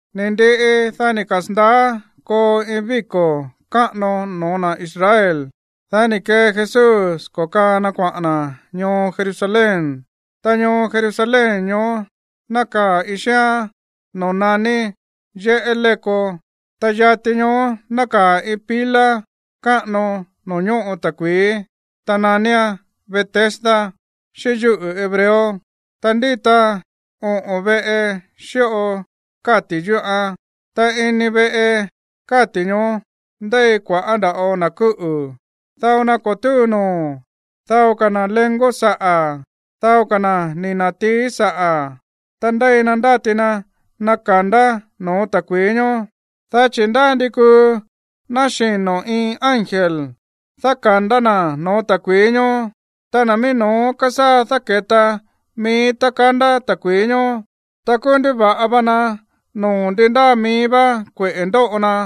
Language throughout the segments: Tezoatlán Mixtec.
Ni̱ ndiꞌi, dá ni̱ kasa̱ndaá koo iin víko̱ káꞌano no̱ó na̱ Israel. Dá ni̱ kee Jesús ko̱kaa na kuaꞌa̱n na̱ ñoo Jerusalén. Ta ñoo Jerusalén ñoó nákaa̱ iin xíán noo̱ naní yéꞌé léko, ta yati ñoó nákaa̱ iin pila káꞌano noo̱ ñóꞌo ta̱kui̱í, ta naníán Betesda xíꞌín yúꞌu̱ hebreo, ta ndíta oꞌo̱n veꞌe xíꞌo káti̱ yúꞌán. Ta ini veꞌe káti̱ ñoó ndéi kua̱ꞌá nda̱ꞌo na̱ kúꞌu̱, dao na ko̱ túu noo̱, dao ka̱ na̱ léngo̱ saꞌa̱, dao ka̱ na̱ ni̱ na̱tií saꞌa̱. Ta ndéi na ndáti na naka̱ndá no̱ó ta̱kui̱í ñoó. Dá chi̱ ndá ndi kúu náxino̱ iin ángel dáka̱ndá na̱ no̱ó ta̱kui̱í ñoó, ta na̱ mií no̱ó kasaa dáke̱ta mií tá kandá ta̱kui̱í ñoó, ta kúú nduva̱ꞌa va na noo̱ ndi ndáa mií vá kueꞌe̱ ndóꞌo na.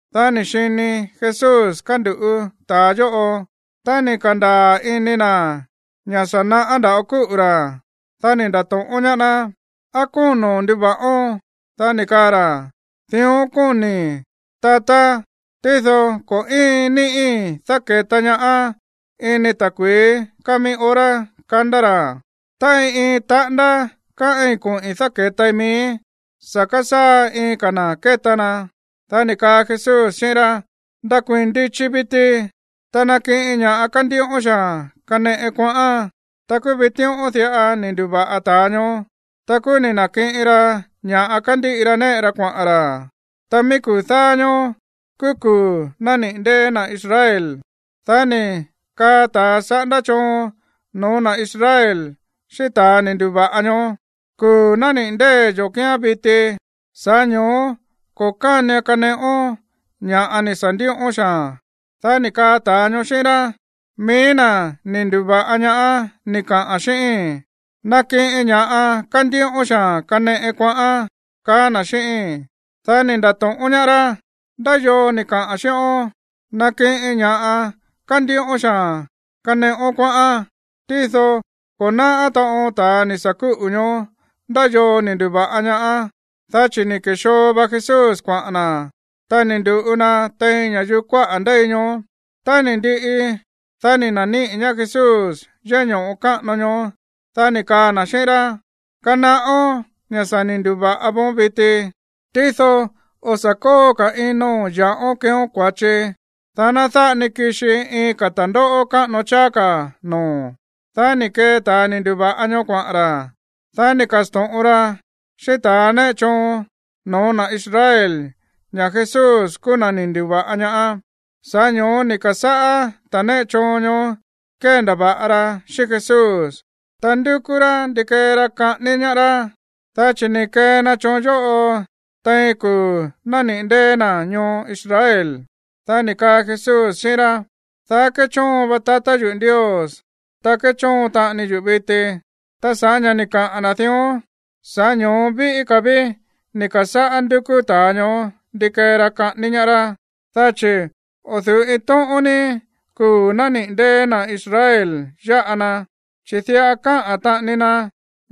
Dá ni̱ xini Jesús kánduꞌu̱ ta̱a yóꞌo. Tá ni̱ ka̱ndaa̱ ini na̱ ña̱ sa̱ naꞌá nda̱ꞌo kúꞌu̱ ra̱, dá ni̱ nda̱to̱ꞌón ñaá ná: ―¿Á kóno̱n nduva̱ꞌón? Dá ni̱ kaa ra̱: ―Dión kóni̱i̱, tatá, tído ko̱ íin ni̱ꞌí dáke̱ta ñaá ini ta̱kui̱í káa mií hora kandá ra̱. Ta iin iin taꞌándá káꞌín koꞌi̱n dáke̱tai miíi̱, sa̱ kasaa iin ka̱ na̱ ke̱ta na. Dá ni̱ kaa Jesús xíꞌín rá: ―Ndakuii̱n ndichi viti. Ta nakiꞌin ña̱ꞌa kándíꞌón xaa̱n kaneꞌón kuaꞌán. Ta kúú vitíꞌón diꞌa ni̱ ndu̱va̱ꞌa ta̱a ñoó. Ta kúú ni̱ na̱kiꞌin ra ña̱ꞌa kándíꞌi ra néꞌe ra kuaꞌa̱n ra̱. Ta mií kuu̱ dáá ñóó kúú kuu̱ nániꞌi̱ ndée̱ na̱ Israel. Dá ni̱ kaa ta̱ saꞌándá choon no̱ó na̱ Israel xíꞌín ta̱ ni̱ ndu̱va̱ꞌa ñoó: ―Kuu̱ nániꞌi̱ ndée̱ yo̱ kíán viti. Sa̱ꞌá ño̱ó ko̱ kánian kaneꞌón ña̱ꞌa ni̱ sa̱ ndíꞌón xaa̱n. Dá ni̱ kaa ta̱a ñoó xíꞌín rá: ―Mií na̱ ni̱ ndu̱va̱ꞌa ñaá ni̱ kaꞌa̱n xíꞌíi̱n: “Nakiꞌin ña̱ꞌa kándíꞌón xaa̱n kaneꞌón kuaꞌán”, kaá na̱ xíꞌíín. Dá ni̱ nda̱to̱ꞌón ñaá rá: ―¿Ndá yoo ni̱ kaꞌa̱n xíꞌón: “Nakiꞌin ña̱ꞌa kándíꞌón xaa̱n kaneꞌón kuaꞌán”? Tído ko̱ náꞌá taꞌon ta̱ ni̱ sa̱ kúꞌu̱ ñoó ndá yoo ni̱ ndu̱va̱ꞌa ñaá, dá chi̱ ni̱ ke̱xoo va Jesús kuaꞌa̱n na̱, ta ni̱ ndu̱ꞌu na tein ña̱yuu kuáꞌa̱ ndéi ñoó. Tá ni̱ ndiꞌi, dá ni̱ na̱níꞌi̱ ñaá Jesús yéꞌé ño̱ꞌo káꞌano ñoó. Dá ni̱ kaa na̱ xíꞌín rá: ―Kanaꞌón ña̱ sa̱ ni̱ ndu̱va̱ꞌa voon viti, tído o̱ sa̱ kóo ka̱ ino̱n ya̱ꞌón keeón kua̱chi, dá ná dáꞌa ni kixi iin ka̱ ta̱ndóꞌó káꞌano cháá ka̱ noo̱o̱n. Dá ni̱ kee ta̱a ni̱ ndu̱va̱ꞌa ñoó kuaꞌa̱n ra̱. Dá ni̱ ka̱sto̱ꞌon ra xíꞌín ta̱ néꞌe choon no̱ó na̱ Israel ña̱ Jesús kúú na̱ ni̱ ndu̱va̱ꞌa ñaá. Sa̱ꞌá ño̱ó ni̱ ka̱sáꞌá ta̱ néꞌe choon ñoó kéndava̱ꞌa rá xíꞌín Jesús, ta ndúkú rá ndi kee ra kaꞌání ñaá rá, dá chi̱ ni̱ kee na choon yóꞌo tein kuu̱ nániꞌi̱ ndée̱ na̱ ñoo Israel. Dá ni̱ kaa Jesús xíꞌín rá: ―Daá kéchóon va tatá yuꞌu̱ Ndios, ta kéchóon taꞌani yuꞌu̱ viti. Ta sa̱ꞌá ña̱ ni̱ kaꞌa̱n na̱ dión, sa̱ꞌá ño̱ó víꞌí ka̱ ví ni̱ ka̱sáꞌá ndúkú ta̱a ñoó ndi kee ra kaꞌání ñaá rá, dá chi̱ o̱ du̱ú iin tóꞌón ni kuu̱ nániꞌi̱ ndée̱ na̱ Israel yáꞌa na, chi̱ diꞌa kaá taꞌani na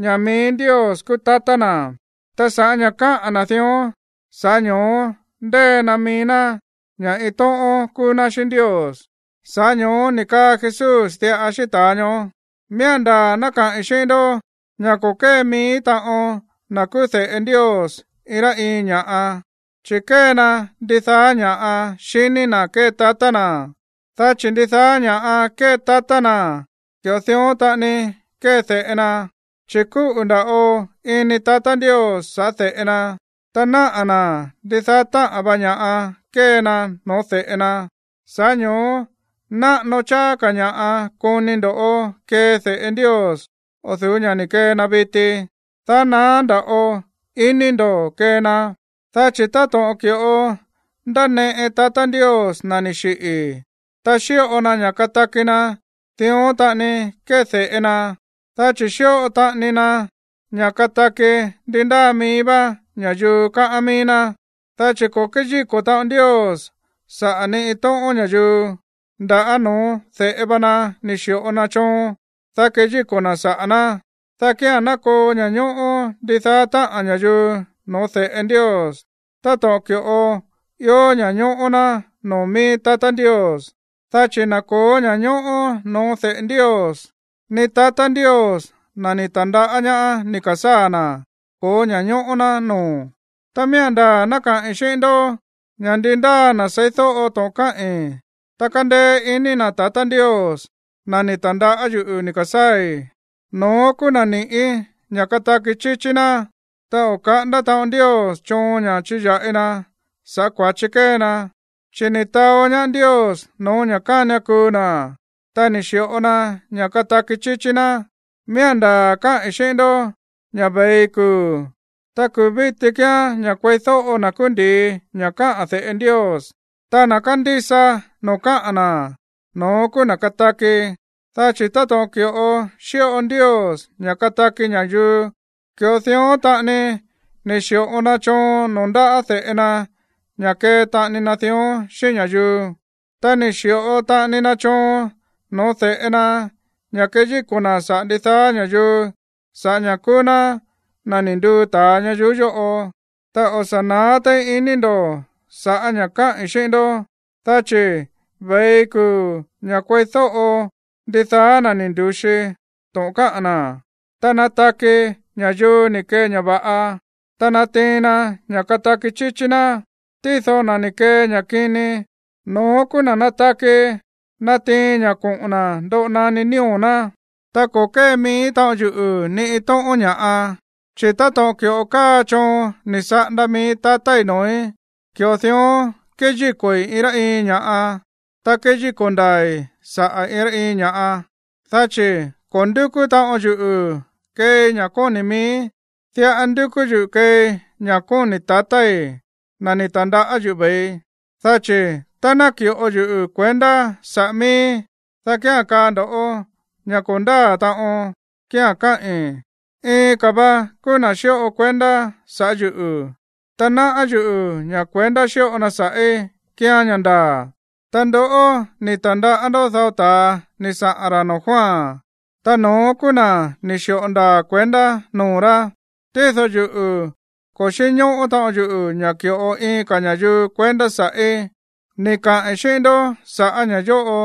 ña̱ mií Ndios kúú tatá na̱, ta sa̱ꞌá ña̱ káꞌa̱n na̱ dión, sa̱ꞌá ño̱ó ndée na mií ná ña̱ iin tóꞌón kúú ná xíꞌín Ndios. Sa̱ꞌá ño̱ó ni̱ kaa Jesús diꞌa xíꞌín ta̱a ñoó: ―Miía̱n ndaa̱ ná kaꞌi̱n xíꞌín ndó ña̱ ko̱ kée mií taꞌon na̱ kúú de̱ꞌe Ndios iin rá iin ña̱ꞌa, chi̱ kée na ndidaá ña̱ xiní na̱ kée tatá na̱, dá chi̱ ndidaá ña̱ꞌa kée tatá na̱, ki̱ꞌo dión taꞌani kée de̱ꞌe na. Chi̱ kúꞌu̱ nda̱ꞌo ini tatá Ndios sa̱ꞌá de̱ꞌe na, ta náꞌa̱ na̱ ndidaá táꞌa̱n va ña̱ꞌa kée na no̱ó de̱ꞌe na. Sa̱ꞌá ño̱ó náꞌano cháá ka̱ ña̱ꞌa koni ndo̱ kee de̱ꞌe Ndios o̱ du̱ú ña̱ ni̱ kee na viti, dá naá nda̱ꞌo iní ndo̱ kee na. Dá chi̱ táto̱ꞌon ki̱ꞌo ndáneꞌe tatá Ndios na̱ ni̱ xiꞌi̱, ta xíꞌo na ña̱ kataki na̱, dión taꞌani kée de̱ꞌe na, dá chi̱ xíꞌo taꞌani na ña̱ kataki ndi ndáa mií vá ña̱yuu káꞌán mií ná. Dá chi̱ ko̱ kéyíko̱ taꞌon Ndios saꞌa̱ ni iin tóꞌón ña̱yuu, nda̱á no̱ó de̱ꞌe va na ni̱ xi̱ꞌo na choon, dá keyíko̱ na̱ saꞌa̱ ná, dá kía̱n ná koo ña̱ñóꞌó ndidaá táꞌa̱n ña̱yuu no̱ó de̱ꞌe Ndios, táto̱ꞌon ki̱ꞌo ió ña̱ñóꞌó ná noo̱ mií tatá Ndios. Dá chi̱ na̱ ko̱ó ña̱ñóꞌó noo̱ de̱ꞌe Ndios, ni tatá Ndios, na̱ ni̱ ta̱ndaꞌá ñaá ni̱ ka̱sáa̱ na̱, ko̱ó ña̱ñóꞌó ná noo̱. ’Ta miía̱n ndaa̱ ná kaꞌi̱n xíꞌín ndó ña̱ ndi ndáa na̱ seídóꞌo to̱ꞌon káꞌi̱n, ta kándeé iní na̱ tatá Ndios, na̱ ni̱ ta̱ndaꞌá yuꞌu̱ ni̱ ka̱sáa̱i̱, no̱ón kúú na̱ ni̱ꞌí ña̱ kataki chíchí ná, ta o̱ káꞌanda taꞌon Ndios choon ña̱ chiya̱ꞌi na sa̱ꞌá kua̱chi kée na, chi̱ ni̱ taó ñaá Ndios no̱ó ña̱ kánian kuu na̱, ta ni̱ xi̱ꞌo na ña̱ kataki chíchí ná. Miía̱n ndaa̱ káꞌi̱n xíꞌín ndó ña̱ ve̱i kuu̱, ta kuu̱ víti kíán ña̱ kueídóꞌo na̱ kúú ndi̱i ña̱ kaꞌa̱n de̱ꞌe Ndios. Ta na̱ kandísa noo̱ kaꞌa̱n na̱, no̱ón kúú na̱ kataki. Dá chi̱ táto̱ꞌon ki̱ꞌo xíꞌo Ndios ña̱ kataki ña̱yuu, ki̱ꞌo dión taꞌani ni̱ xi̱ꞌo na choon noo̱ ndáꞌa̱ de̱ꞌe na ña̱ kee taꞌani na dión xíꞌín ña̱yuu. Ta ni̱ xi̱ꞌo taꞌani na choon no̱ó de̱ꞌe na ña̱ keyíko̱ na̱ saꞌa̱ ndidaá ña̱yuu sa̱ꞌá ña̱ kúú ná na̱ ni̱ nduu ta̱a ñayuú yóꞌo. Ta o̱ sa̱ naá téí ini ndo̱ sa̱ꞌá ña̱ káꞌi̱n xíꞌín ndó, dá chi̱ ve̱i kuu̱ ña̱ kueídóꞌo ndidaá na̱ ni̱ ndu̱xi to̱ꞌon kaꞌa̱n na̱, ta nataki ña̱yuu ni̱ kee ña̱ va̱ꞌa, ta natiin na ña̱ kataki chíchí ná. Tído na̱ ni̱ kee ña̱ kini, no̱ón kúú na̱ nataki natiin ña̱ koꞌo̱n na̱ ndoꞌo naní nío̱ ná. ’Ta ko̱ kée mií taꞌon yuꞌu̱ ni iin tóꞌón ña̱ꞌa. Chi̱ táto̱ꞌon ki̱ꞌo káa choon ni̱ saꞌanda mií tatái̱ noo̱í, ki̱ꞌo dión kéyíko̱i̱ iin rá iin ña̱ꞌa, ta kéyíko̱ ndaa̱i̱ saꞌa̱ iin rá iin ña̱ꞌa, dá chi̱ ko̱ ndúkú taꞌon yuꞌu̱ keei ña̱ kóni̱ miíí, diꞌa ndúkú yuꞌu̱ keei ña̱ kóni̱ tatái̱, na̱ ni̱ ta̱ndaꞌá yuꞌu̱ ve̱i. Dá chi̱ tá ná ki̱ꞌo yuꞌu̱ kuendá saꞌa̱ mííí, dá kía̱n kaa ndo̱ ña̱ ko̱ ndáa̱ taꞌon kía̱n káꞌi̱n. Iin ka̱ va na kúú na̱ xíꞌo kuendá sa̱ꞌá yuꞌu̱. Ta náꞌá yuꞌu̱ ña̱ kuendá xíꞌo na sa̱ꞌí kíán ña̱ ndaa̱. Ta ndoꞌó ni̱ ta̱ndaꞌá ndó dao ta̱a ni̱ saꞌa̱n ra̱ noo̱ Juan, ta no̱ón kúú na̱ ni̱ xi̱ꞌo ndaa̱ kuendá noo̱ rá. Tído yuꞌu̱, ko̱ xínñóꞌó taꞌon yuꞌu̱ ña̱ ki̱ꞌo iin ka̱ ña̱yuu kuendá sa̱ꞌí. Ni̱ kaꞌi̱n xíꞌín ndó sa̱ꞌá ña̱ yóꞌo,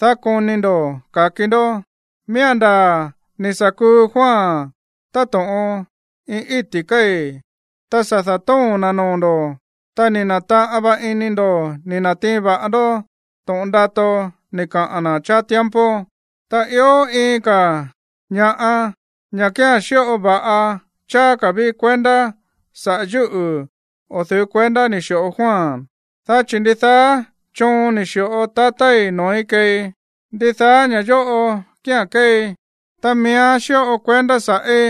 dá koni ndo̱ ka̱ki ndó. Miía̱n ndaa̱ ni̱ sa̱ kuu Juan táto̱ꞌon iin íti̱ kéi̱, ta sa̱ da̱tóo̱n na̱ noo̱ ndo̱, ta ni̱ na̱taꞌan va̱ꞌa ini ndo̱ ni̱ na̱tiin va̱ꞌa ndó to̱ꞌon ndato ni̱ kaꞌa̱n na̱ cháá tiempo. ’Ta ió iin ka̱ ña̱ꞌa, ña̱ kía̱n xíꞌo va̱ꞌa cháá ka̱ ví kuendá sa̱ꞌá yuꞌu̱ o̱ du̱ú kuendá ni̱ xi̱ꞌo Juan. Dá chi̱ ndidaá choon ni̱ xi̱ꞌo tatái̱ noo̱í keei, ndidaá ña̱ yóꞌo kía̱n kéei, ta miía̱n xíꞌo kuendá sa̱ꞌí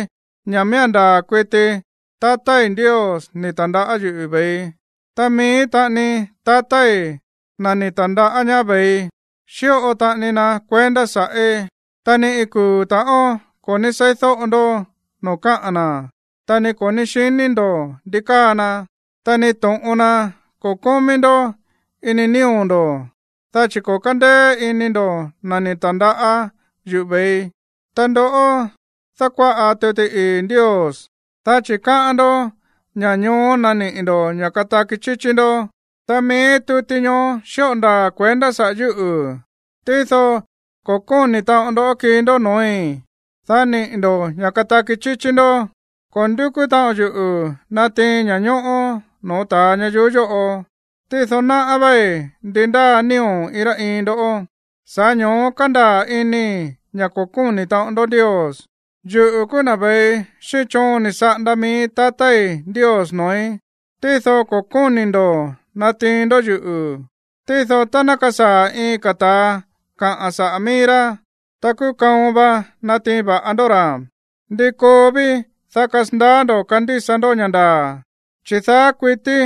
ña̱ miía̱n ndaa̱ kuiti tatái̱ Ndios ni̱ ta̱ndaꞌá yuꞌu̱ ve̱ii. Ta mií taꞌani tatái̱, na̱ ni̱ ta̱ndaꞌá ñaá ve̱ii, xíꞌo taꞌani na kuendá sa̱ꞌí. Ta ni iin kuu̱ ta̱ꞌón ko̱ ní seídóꞌo ndó noo̱ káꞌa̱n na̱, ta ni ko̱ ní xiní ndo̱ ndi káa na, ta ni to̱ꞌon na ko̱ kómí ndó ini nío̱ ndo̱, dá chi̱ ko̱ kándéé iní ndo̱ na̱ ni̱ ta̱ndaꞌá yuꞌu̱ ve̱ii. Ta ndoꞌó dákuáꞌa tuti ii̱ Ndios, dá chi̱ káꞌán ndó ña̱ ñoó naniꞌi̱ ndo̱ ña̱ kataki chíchí ndó. Ta mií tuti ñoó xíꞌo ndaa̱ kuendá saꞌa̱ yúꞌu̱, tído ko̱ kóni̱ taꞌon ndó kii ndó noo̱í, dá niꞌi̱ ndo̱ ña̱ kataki chíchí ndó. ’Ko̱ ndúkú taꞌon yuꞌu̱ natiin ña̱ñóꞌó no̱ó ta̱a ñayuú yóꞌo. Tído náꞌá váí ndi ndáa nío̱ iin rá iin ndó, sa̱ꞌá ño̱ó kándaa̱ inii̱ ña̱ ko̱ kóni̱ taꞌon ndó Ndios. Yuꞌu̱ kúú na̱ ve̱ii xíꞌín choon ni̱ saꞌanda mií tatái̱ Ndios noo̱í, tído ko̱ kóni̱ ndo̱ natiin ndó yuꞌu̱. Tído tá ná kasaa̱ iin ka̱ ta̱a kaꞌa̱n saꞌa̱ mií rá, ta kúú kaon va natiin va̱ꞌa va ndó ra̱. ¿Ndi koo ví, dá kasandaá ndo̱ kandísa ndó ña̱ ndaa̱, chi̱ daá kuití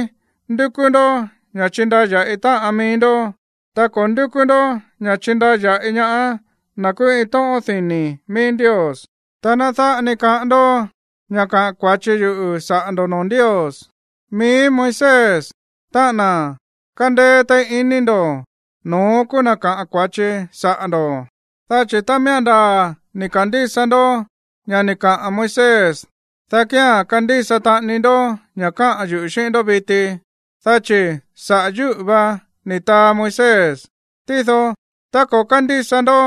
ndúkú ndó ña̱ chindaya̱ꞌi táꞌan mií ndó, ta ko̱ ndúkú ndó ña̱ chindaya̱ꞌi ñaá na̱ kúú iin tóꞌón dini̱ mií Ndios? Ta ná dáꞌa ni kaꞌán ndó ña̱ kaꞌa̱n kua̱chi yuꞌu̱ saꞌa̱ ndo̱ꞌó noo̱ Ndios. Mií Moisés, táꞌa̱n na̱ kándéé téí iní ndo̱, no̱ón kúú na̱ káꞌa̱n kua̱chi saꞌa̱ ndo̱. Dá chi̱ tá miía̱n ndaa̱ ni̱ ka̱ndísa ndó ña̱ ni̱ kaꞌa̱n Moisés, dá kía̱n kandísa taꞌani ndó ña̱ káꞌa̱n yuꞌu̱ xíꞌín ndó viti, dá chi̱ saꞌa̱ yúꞌu̱ va ni̱ taa Moisés. Tído, tá ko̱ kándísa ndó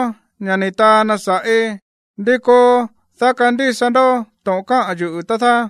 ña̱ ni̱ taa na sa̱ꞌí, ¿ndi koo, dá kandísa ndó to̱ꞌon káꞌa̱n yuꞌu̱, tá dáá?